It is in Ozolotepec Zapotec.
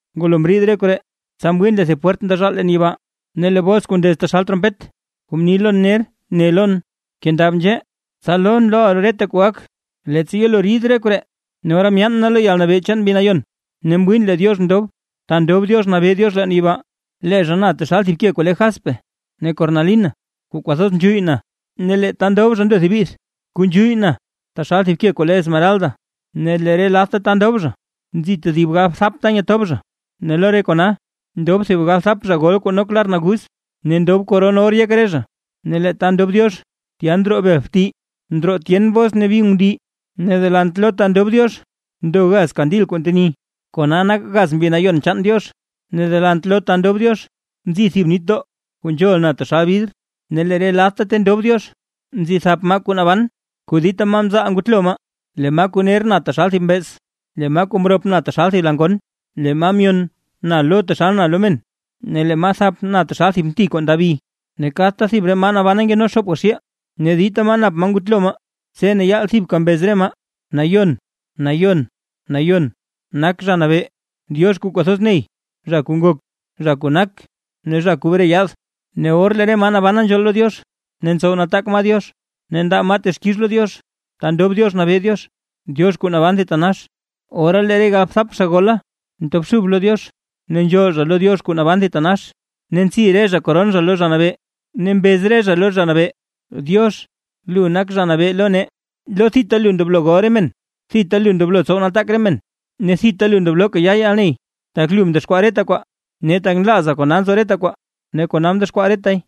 Ngulo mriid re koree, tsa mwiin lee thib pwert ndezhaal leen yibaa; ne lee bos kuu ndez taxal trompet, kuu mni lon ner, ne lon: ―Kendab nzhee, tsa lon loʼa reta kuu gak, leettsa yelo rid re koree. Ne ora myaan na lo yalnabee chaan Mbi Nayon, ne mwiin lee Diox ndob, ta ndob Diox nabee Diox leen yibaa. Lee zha na taxal thib ke kuu le jaspe ne cornalina kuu kwathoz nzhuyy na; ne lee ta ndob zha ndo thib bith, kuu nzhuyy na taxal thib ke kuu le esmeralda. Ne lee re ladta ta ndob zha, nzi tedib galbthap ta nyetob zha, ne lo re kona ndob thib galbthap zha gol kuu nok lar naguz ne ndob koron or yek re zha. Ne lee ta ndob Diox tya ndroo bel bti, ndroo tyen bos ne bi ngundii; ne delant lo ta ndob Diox ndo gaz kandil kuu nteni, kona nak gaz Mbi Nayon chaan Diox. Ne delant lo ta ndob Diox nzi thib nitdoo kuu nzhol na taxal bidr. Ne lee re ladta ta ndob Diox, nzi thap maa kuu naban kuu dita maa mzaal ngutlo maa. Lee maa kuu ner na taxal thib mbeez; lee maa mrop na taxal thib la ngon; lee maa myon na lo taxal na lo men; ne lee maa thap na taxal thib mti kuu ndabi. Ne kadta thib re maa nabana nkeno xoopga xiil, ne dita maa nap maa ngutlo maa; tse ne yaal thibka mbez re maa: ¡Nayon, nayon, nayon, nak Zha Nabee, Diox kuu kwathoz ney, zha kuu ngok, zha kuu nak ne zha kuu bre yaad! Ne or kuu lee re maa nabana nzhool lo Diox, ne ntsow nataak maa Diox, ne ndaa maa texkix lo Diox ta ndob Diox nabee Diox, Diox kuu naban thitanax, ora lee re galbthap zha gola ntobxub lo Diox, ne nzhool zha lo Diox kuu naban thitanax, ne ntsi re zha koron zha lo Zha Nabee. Ne mbez re zha lo Zha Nabee: Diox, lu nak Zha Nabee lo nee, lo thita lu ndoblo gol re men, thita lu ndoblo tsow nataak re men, ne thita lu ndoblo kayaa yalney; tak lu mdexkwaa reta kwaa, ne tak nlaaza kona nzo reta kwaa ne kona mdexkwaa retay.